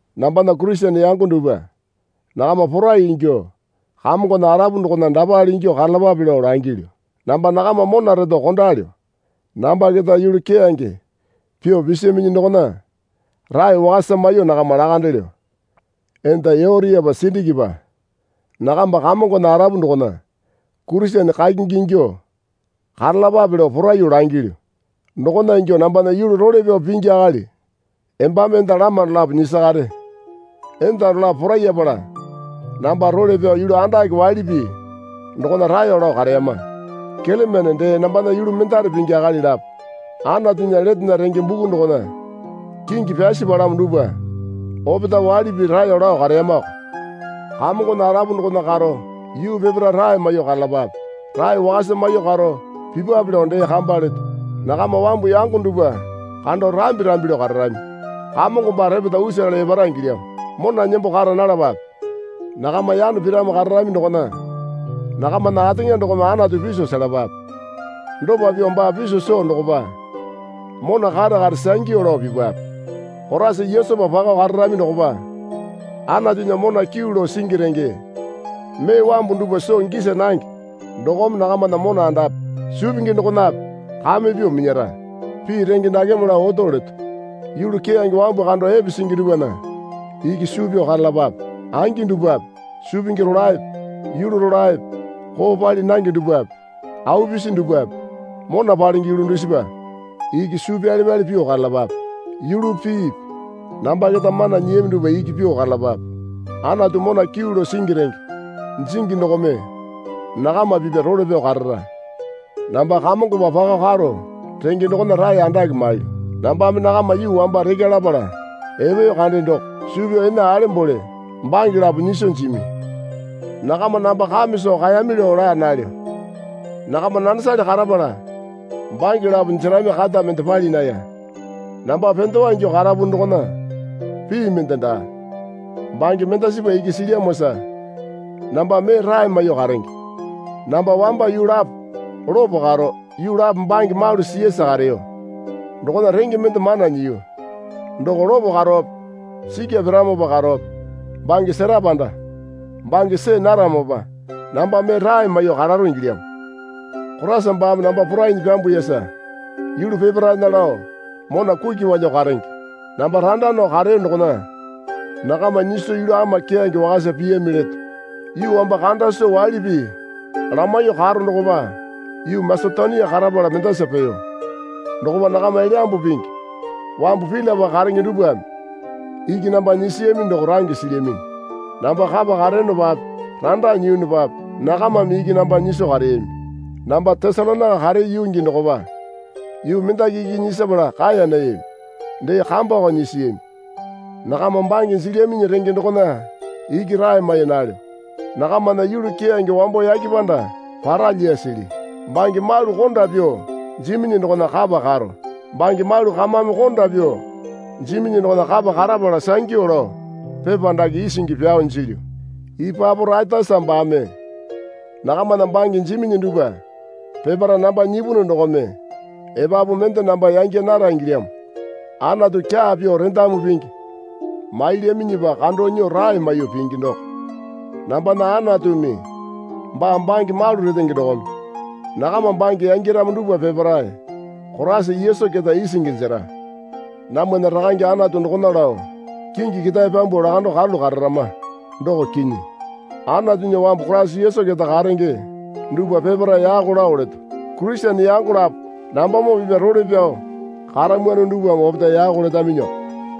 Nambana Kurisene yango dupwa. Nakama porai ingyuo Kamongona arapu dokona dapale ingyuo karalapape lao langilyu. Namba nakama mona reto kondalyo. Namba keta yulu keyange pyuo pisaminyi dokona rae wakasa maiyuo nakama lakandelyo. Enda Yotiapa Sindikipa nakamba Kamongona arapu dokona Kurisene kakingi ingyuo karalapape lao poraiyuo langilyu. Dokona ingyuo nambana yulu role pyao pingi akali embame enda lama dolapo nyisakare. Enda dolapo porayapala namba role pyao yulu andake waili pii dokona raeyo lao kareyama. Kelemene dee nambana yulu mendare pingi akali lapo Anatunya letena renge buku dokona kingi pyasi palamo dupwa opetae waili pii raeyo lao kareyamako. Kamongona arapu dokona karo yuu peparae rae maiyuo karalapape. Rae wakasa maiyuo karo pipwape lao dee kamba leto. Nakama wambu yango dupwa kando rambi rambi lao kararami. Kamongo baa repeta usale epara ingilyamo. Mona nembo kara nalapape. Nakama yano piramo kararami dokona nakamana ateŋa dokome Anatu piso selapape. Dopa pyuo baa piso soo dokopa mona kare kare sangyu lao pipape. Koraisa Yesupa pako kararami dokopa Anatunya mona kyuu lao singi renge mee wambu dupwa soo gisa nange dokome nakamana mona andape suu pingi dokonape kame pyuo minyara. Pii renge dakeme lao oto leto. Yulu keyange wambu kando epe singi dupwana iki suu pyao karalapape. Angi dupwape, suu pingi rolaepe yulu rolaepe koo pali nange dupwape au pisi dupwape mona palenge yulu dusipa iki suu pyale pyale pyuo karalapape. Yulupi piipi namba keta mana nyiyami dupwa iki pyuo karalapape. Anatu mona kyuu lao singi renge jingi dokome nakama pipya role pyao karara. Namba Kamongopa pako karo renge dokona rae andake mailyu. Nambame nakama yuu wamba rekya lapala epeyo kande doko suu pyao ene alembole bange lapo nyiso jimi. Nakama namba kame soo kaeyami lao laa nalyo. Nakama nanesale karapala bange lapo jerami kata mende pali naya. Namba pendewa ingyuo karapunu dokona pii mende daa. Bange mendasipa iki silyamosa namba mee rae maiyuo karenge. Namba wamba yuu lapo lopo karo, yuu lapo bange malu siyasa kareyo dokona renge mende mana nyiyu. Doko lopo karowape sikya piramopa karowape bange sera panda bange see naramopa namba mee rae maiyuo kararo ingilyamo. Koraisa baame namba porainyi pyambuyasa yulu peparaena lao mona kuki palyuo karenge. Namba randa nao kareyo dokona nakama nyiso yulu ama keyange wakasa piyami leto. Yuu wamba kanda soo waili pii lamaiyuo karo dokopa yuu Masetonia karapala mendasa peyo. Dokopa nakama Elyambu Pingi wambu Pilipai karenge dupwame iki namba nyisiyami doko range silyaminyi. Namba kapa kareyonopape randa nyiyunupape nakamame iki namba nyiso kareyami. Namba Tesalonaika kareyo yuu gii dokopa yuu mendaki iki nyisapala kaeya nayami. Dee kambako nyisiyami. Nakama bange jilyaminyi renge dokona iki rae mai nalyo. Nakamana yulu keyange wambo yake panda para lyasili. Bange malu konda pyuo jiminyi dokona kapa karo. Bange malu kamame konda pyuo jiminyi dokona kapa karapala sangyu lao pepa dake isingi pyao jilyu. Ipaporaitasa baame nakamana bange jiminyi dupwa peparae namba nyipunu dokome epapu mende namba yangya nara ingilyamo. Anatu kyaa pyuo rendamu pingi mailyaminyipa kando nyuo rae maiyuo pingi doko. Nambana Anatumi baa bange malu retenge dokome nakama bange yangyaramo dupwa peparae Koraisa Yesu keta isingi jera. Namwana Rakange Anatu dokona lao kingi ketae pyambuo lakando karalu kararama. Doko kinyi. Anatunya wambu Koraisa Yesu keta karenge dupwa peparae yako lao leto. Kurisene yango lapo nambamoo pipya role pyao karamwano dupwame opetae yako letaminyiko.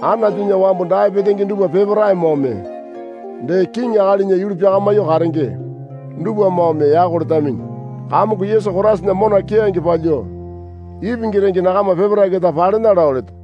Anatunya wambu dae petenge dupwa peparaemoome dee kiŋi akalinya yulu pyakamyuo karenge dupwamoome yako letaminyi. Kamongo Yesu Koraisana mona keyange palyuo ipingi renge nakama peparae keta palena lao leto.